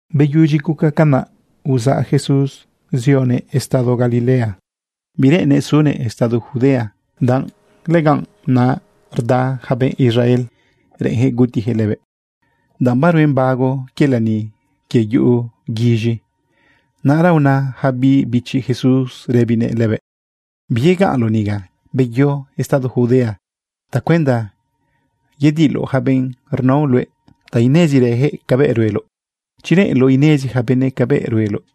Beyudyi guca canꞌ, uzaꞌ Jesús zioguëꞌ estado Galilea. Bireꞌennëꞌ sunëꞌ estado Judea, danꞌ lëganꞌ naꞌ rda yaca benꞌ Israel reꞌenyaquëꞌ gutiyaquëꞌ lëbëꞌ. Danꞌ baruen bago quie lani quie yuꞌu guiz̃i, naꞌra una yaca biꞌ bichi Jesús rëbinëꞌ lëbëꞌ: ―Biyegaꞌnloꞌ niga, beyo estado Judea tacuenda yediloꞌ yaca benꞌ rnao luëꞌ ta inezirëyaquëꞌ cabëꞌ rueloꞌ. Chi reꞌenloꞌ inezi yaca benëꞌ cabëꞌ rueloꞌ,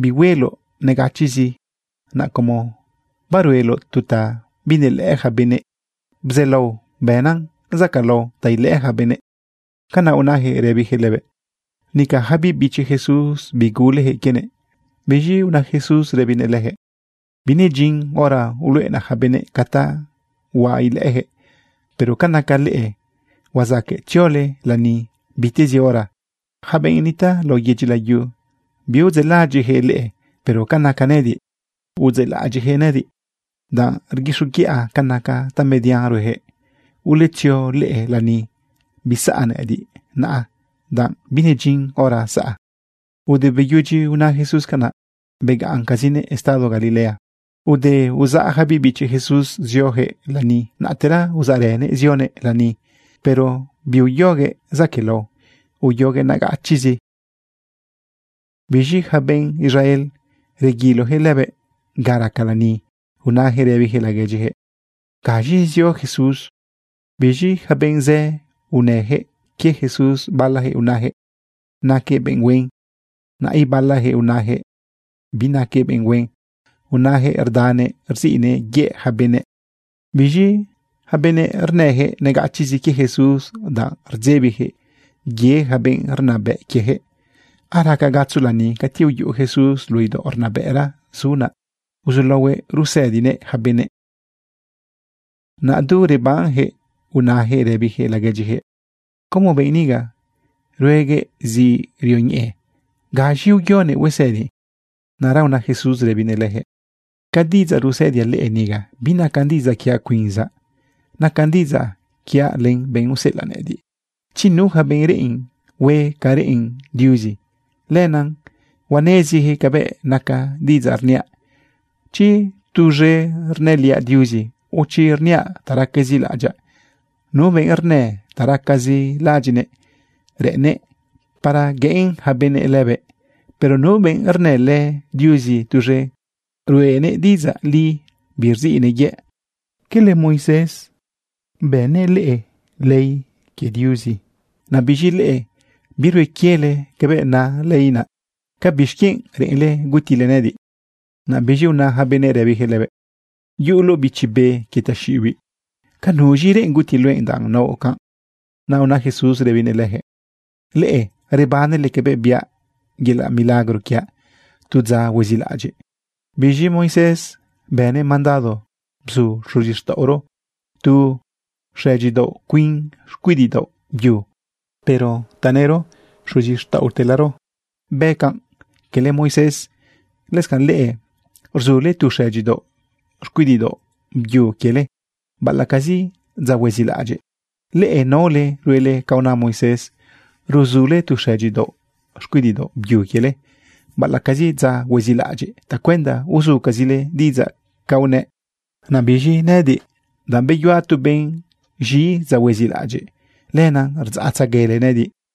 bihueloꞌ negachiꞌzi. Naꞌ como barueloꞌ tu ta binelëꞌë yaca benëꞌ, bzaꞌlao bënan zacaꞌlao ta ilëꞌë yaca benëꞌ. ―Canaꞌ unayaquëꞌ rëbiyaquëꞌ lëbëꞌ. Nica yaca biꞌ bichi Jesús biguleyaquëꞌ quienëꞌ. Biz̃i una Jesús rëbinëꞌ leyaquëꞌ: ―Binedyin hora uluꞌenaꞌ yaca benëꞌ ca ta huaꞌ ilëꞌëyaquëꞌ. Pero ca naca leꞌe, huazaqueꞌ tziole lani bitezi hora. Yaca benꞌ nitaꞌ lao yedyi layu biudzeꞌlaꞌadyiꞌyaquëꞌ leꞌe. Pero ca naca nëꞌëdiꞌ, sí, udzeꞌlaꞌadyiꞌyaquëꞌ nëꞌëdiꞌ, danꞌ rguixoguiꞌa ca naca tamedian rueyaquëꞌ. Uletzio leꞌe lani. Bisaꞌ nëꞌëdiꞌ naꞌa, danꞌ binedyin hora saꞌa. Ude beyudyi una Jesús canaꞌ, begaꞌncazinëꞌ estado Galilea. Ude uzaꞌ yaca biꞌ bichi Jesús zioyaquëꞌ lani, naꞌtera uzaꞌrënëꞌ zionëꞌ lani, pero biuyoguëꞌ zaquëꞌlao, uyoguëꞌ negachiꞌzi. Biz̃i yaca benꞌ Israel reguiloyaquëꞌ lëbëꞌ ga raca lani unayaquëꞌ rëbiyaquëꞌ laguedyiyaquëꞌ: ―¿Gaz̃i zio Jesús? Biz̃i yaca benꞌ zë unëyaquëꞌ quie Jesús. Balayaquëꞌ unayaquëꞌ naquëꞌ benꞌ huen. Naꞌ ibalayaquëꞌ unayaquëꞌ binaquëꞌ benꞌ huen, unayaquëꞌ rdanëꞌ rziꞌnëꞌ yëꞌ yaca benëꞌ. Biz̃i yaca benëꞌ rnëyaquëꞌ negachiꞌzi quie Jesús, danꞌ rdzebiyaquëꞌ ye yaca benꞌ rnabëꞌ quieyaquëꞌ. Araca gatzo lani cati uyuꞌu Jesús luꞌu idaoꞌ rnabëꞌra zu naꞌ, naꞌ uzulaohuëꞌ rusëdiguëꞌ yaca benëꞌ. Naꞌ du rebanyaquëꞌ unayaquëꞌ rëbiyaquëꞌ laguedyiyaquëꞌ: ―¿Cómo benꞌ niga rueguëꞌ zi rioñeꞌe? ¿Gaz̃i uyonëꞌ huesëdi? Naꞌra una Jesús rëbinëꞌ leyaquëꞌ: ―Ca diꞌidzaꞌ rusëdiaꞌ leꞌe niga, binacan diꞌidzaꞌ quiaꞌ cuinzaꞌ, nacan diꞌidzaꞌ quiaꞌ len benꞌ useꞌelaꞌ nëꞌëdiꞌ. Chi nu yaca benꞌ reꞌen hue ca reꞌen Diuzi, lenaꞌ huaneziyaquëꞌ cabëꞌ naca diꞌidzaꞌ rniaꞌ, chi tuz̃e rnëliaꞌ Diuzi, o chi rniaꞌ ta racazi laꞌadyaꞌ. Nu benꞌ rnë ta racazi laꞌadyiꞌnëꞌ reꞌennëꞌ para gueꞌen ja benëꞌ lëbëꞌ. Pero nu benꞌ rnëlë Diuzi tuz̃e, ruꞌenëꞌ diꞌidzaꞌ li, birziꞌnëꞌ yëꞌ. ’¿Quele Moisés bënnëꞌ leꞌe ley quie Diuzi? Naꞌ biz̃i leꞌe birue quiele cabëꞌ na ley naꞌ. ¿Ca bixquienꞌ reꞌenle gutile nëꞌëdiꞌ? Naꞌ biz̃i una yaca benëꞌ rëbiyaquëꞌ lëbëꞌ: ―Yuꞌuloꞌ bichi be quie taxiꞌibiꞌ. ¿Ca nuz̃i reꞌen guti luëꞌ danꞌ naoꞌ canꞌ? Naꞌ una Jesús rëbinëꞌ leyaquëꞌ: ―Leꞌe rebanele cabëꞌ biaꞌ yelaꞌ milagro quiaꞌ tu dza huezilaꞌadyiꞌ. Biz̃i Moisés bënëꞌ mandado bzu xuzixtaꞌoro tu xëdyidaoꞌ cuin xcuidiꞌdaoꞌ byu. Pero tanëro xuzixtaꞌotelaro bëꞌ canꞌ, cala Moisés. Lëscanꞌ leꞌe ruzule tu xëdyidaoꞌ xcuidiꞌdaoꞌ byu quiele, baꞌalaꞌcazi dza huezilaꞌadyiꞌ. Leꞌe naole ruele ca una Moisés, ruzule tu xëdyidaoꞌ xcuidiꞌdaoꞌ byu quiele baꞌalaꞌcazi dza huezilaꞌadyiꞌ tacuenda uzucazile diꞌidzaꞌ ca unëꞌ. Naꞌ biz̃i nëꞌëdiꞌ, danꞌ beyuaꞌ tu benꞌ z̃i dza huezilaꞌadyiꞌ, lenaꞌ rdzaꞌtzeguele nëꞌëdiꞌ.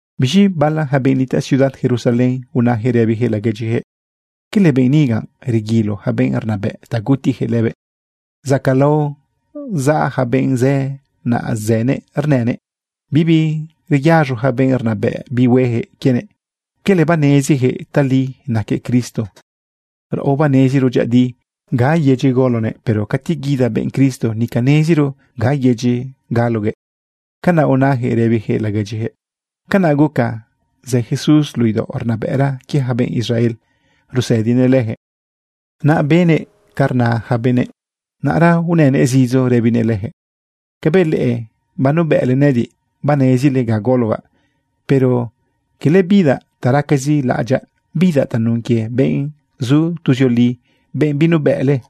Biz̃i bala yaca benꞌ nitaꞌ ciudad Jerusalén unayaquëꞌ rëbiyaquëꞌ laguedyiyaquëꞌ: ―¿Cala benꞌ niga reguilo yaca benꞌ rnabëꞌ ta gutiyaquëꞌ lëbëꞌ? Zacaꞌlao zaꞌ ja benꞌ zë naꞌ zënëꞌ rnënëꞌ. Bibi reyaz̃o yaca benꞌ rnabëꞌ bihueyaquëꞌ quienëꞌ. ¿Cala baneziyaquëꞌ tali naquëꞌ Cristo? Raꞌo baneziro dyëꞌëdi ga yedyi golonëꞌ. Pero cati guida benꞌ Cristo, nica neziro ga yedyi galoguëꞌ. ―Canaꞌ unayaquëꞌ rëbiyaquëꞌ laguedyiyaquëꞌ. Canaꞌ guca zë Jesús luꞌu idaoꞌ rnabëꞌra quie yaca benꞌ Israel rusëdinëꞌ leyaquëꞌ, naꞌ benëꞌ ca rna yaca benëꞌ. Naꞌra unënëꞌ zidzo rëbinëꞌ leyaquëꞌ: ―Cabëꞌ leꞌe banubëꞌle nëꞌëdiꞌ, banezile ga gologaꞌ. Pero cala bidaꞌ ta racazi laꞌadyaꞌ. Bidaꞌ tanun quie benꞌ zu tuzioli, benꞌ binubëꞌle.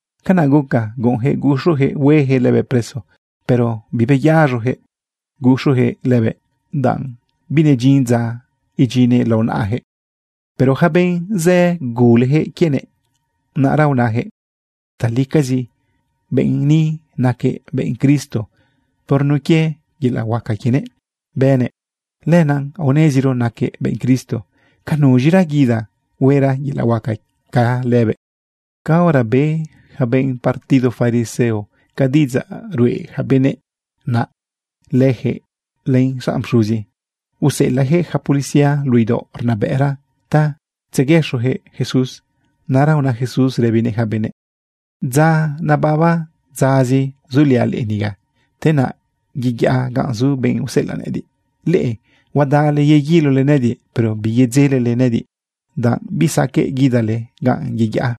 Canaꞌ guca guꞌunyaquëꞌ guxuyaquëꞌ hueyaquëꞌ lëbëꞌ preso, pero bibeyaz̃oyaquëꞌ guxuyaquëꞌ lëbëꞌ, danꞌ binedyin dza idyinnëꞌ lao naꞌayaquëꞌ. Pero yaca benꞌ zë, guleyaquëꞌ quienëꞌ. Naꞌra unayaquëꞌ: ―Talicazi benꞌ ni naquëꞌ benꞌ Cristo. Por nun quie yelaꞌ huaca quienëꞌ bënëꞌ, lenaꞌ aoneziro naquëꞌ benꞌ Cristo. ¿Ca nuz̃ira guida huera yelaꞌ huaca ca lëbëꞌ? Caora be yaca benꞌ partido fariseo ca diꞌidzaꞌ ruꞌe yaca benëꞌ, naꞌ leyaquëꞌ len xanꞌ pxuzi, useꞌelaꞌyaquëꞌ yaca policía luꞌu idaoꞌ rnabëꞌra ta tzeguëxoyaquëꞌ Jesús. Naꞌra una Jesús rëbinëꞌ yaca benëꞌ: ―Dza nababa dzazi zuliaꞌ leꞌe niga, te naꞌ yeyaꞌa ganꞌ zu benꞌ useꞌelaꞌ nëꞌëdiꞌ. Leꞌe huadale yeguilole nëꞌëdiꞌ, pero biyedzelele nëꞌëdiꞌ, danꞌ bisaqueꞌ guidale ganꞌ yeyaꞌa.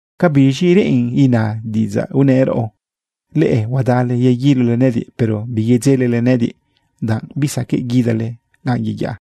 ¿Ca biz̃i reꞌen ina diꞌidzaꞌ unëꞌ raꞌo: “Leꞌe huadale yeguilole nëꞌëdiꞌ, pero biyedzelele nëꞌëdiꞌ, danꞌ bisaqueꞌ guidale ganꞌ yeyaꞌa.”?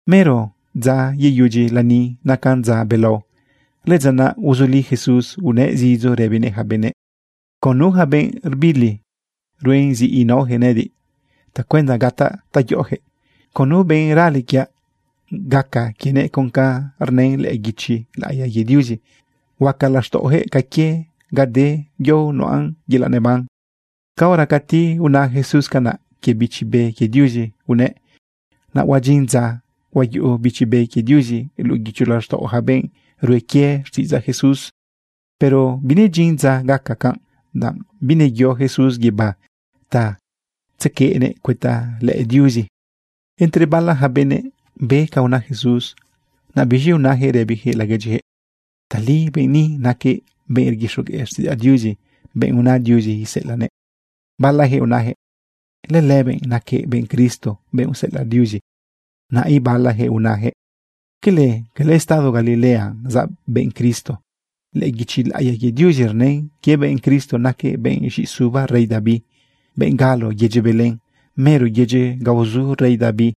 Mero dza yeyudyi lani nacan dza belao. Lëdza naꞌ uzuli Jesús unëꞌ zidzo rëbinëꞌ yaca benëꞌ: ―Con nu yaca benꞌ rbili, ruen zi inaoyaquëꞌ nëꞌëdiꞌ tacuenda gataꞌ ta yoꞌoyaquëꞌ. Con nu benꞌ rale quiaꞌ, gaca quienëꞌ con ca rnë lëꞌë guichi laꞌiya quie Diuzi: “Huaca laxtaꞌoyaquëꞌ ca quie ga de yao nuꞌan yelaꞌ neban.” Caora cati una Jesús canaꞌ, quie Bichi Be quie Diuzi unëꞌ. Naꞌ huadyin dza huayuꞌu Bichi Be quie Diuzi luꞌu guicho laxtaꞌo yaca benꞌ rue quie quie xtiꞌidzaꞌ Jesús, pero binedyin dza gaca canꞌ danꞌ bineyo Jesús guibá ta tzequeꞌnëꞌ cuëta lëꞌë Diuzi. Entre bala yaca benëꞌ be ca una Jesús, naꞌ biz̃i unayaquëꞌ rëbiyaquëꞌ laguedyiyaquëꞌ: ―Tali benꞌ niga naquëꞌ benꞌ rguixogueꞌ xtiꞌidzaꞌ Diuzi, benꞌ una Diuzi iseꞌelaꞌnëꞌ. Balayaquëꞌ unayaquëꞌ: ―Lëlëbëꞌ naquëꞌ benꞌ Cristo, benꞌ useꞌelaꞌ Diuzi. Naꞌ ibalayaquëꞌ unayaquëꞌ: ―¿Quele, cala estado Galilea zaꞌ benꞌ Cristo? Lëꞌë guichi laꞌiya quie Diuzi rnën quie benꞌ Cristo naquëꞌ benꞌ z̃iꞌisuba rey David, benꞌ galo yedyi Belén, mero yedyi ga uzu rey David.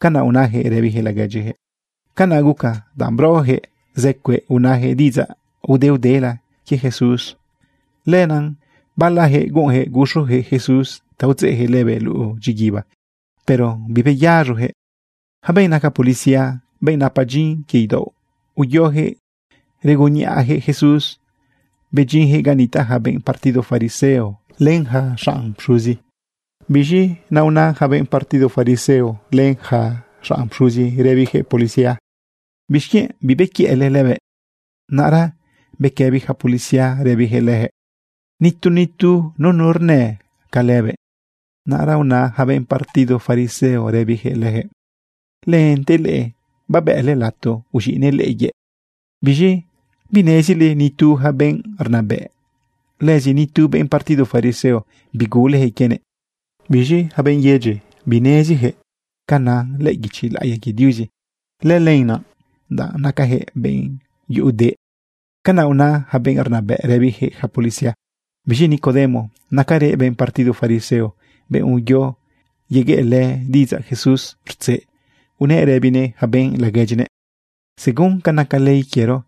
―Canaꞌ unayaquëꞌ rëbiyaquëꞌ laguedyiyaquëꞌ. Canaꞌ guca, danꞌ brojëꞌ zë cueꞌ unayaquëꞌ diꞌidzaꞌ udeudela quie Jesús. Lenaꞌ balayaquëꞌ guꞌunyaquëꞌ guxuyaquëꞌ Jesús ta udzeꞌyaquëꞌ lëbëꞌ luꞌu dyiguiba, pero bibeyaz̃oyaquëꞌ. Yaca benꞌ naca policía, benꞌ napa dyin quie idaoꞌ uyoyaquëꞌ regunniꞌajëꞌ Jesús bedyinyaquëꞌ ga nitaꞌ yaca benꞌ partido fariseo len yaca xanꞌ pxuzi. Biz̃i naꞌ una yaca benꞌ partido fariseo len yaca xanꞌ pxuzi rëbiyaquëꞌ policía: ―¿Bixquienꞌ bibequiëꞌle lëbëꞌ? Naꞌra bequëbi yaca policía rëbiyaquëꞌ leyaquëꞌ: ―Nitu nitu nunu rnë ca lëbëꞌ. Naꞌra una yaca benꞌ partido fariseo rëbiyaquëꞌ leyaquëꞌ: ―¿Lente leꞌe babëꞌle lato uz̃iꞌnëꞌ leꞌe yëꞌ? ¿Biz̃i binezile nitu yaca benꞌ rnabëꞌ, lëzi nitu benꞌ partido fariseo, biguleyaquëꞌ quienëꞌ? Biz̃i yaca benꞌ yedyi bineziyaquëꞌ ca na lëꞌë guichi laꞌiya quie Diuzi. Lëlenaꞌ danꞌ nacayaquëꞌ benꞌ yuꞌu deꞌ. ―Canaꞌ una yaca benꞌ rnabëꞌ rëbiyaquëꞌ yaca policía. Biz̃i Nicodemo naquerëꞌ benꞌ partido fariseo, benꞌ uyo yegueꞌlë diꞌidzaꞌ Jesús rtzeꞌ, unëꞌ rëbinëꞌ yaca benꞌ laguedyinëꞌ: ―Según ca naca ley quiero,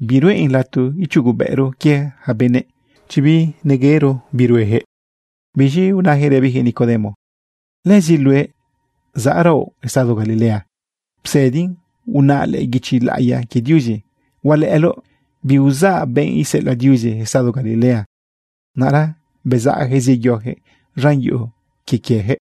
biruꞌen lato ichugobëꞌro quie yaca benëꞌ chi bineyero bi rueyaquëꞌ. Biz̃i unayaquëꞌ rëbiyaquëꞌ Nicodemo: ―¿Lëzi luëꞌ, zaꞌraoꞌ estado Galilea? Psëdin unaꞌ lëꞌë guichi laꞌiya quie Diuzi, hualëꞌëloꞌ biuzaꞌ benꞌ iseꞌelaꞌ Diuzi estado Galilea. Naꞌra bezaꞌyaquëꞌ zeyoyaquëꞌ z̃an yuꞌu quie quieyaquëꞌ.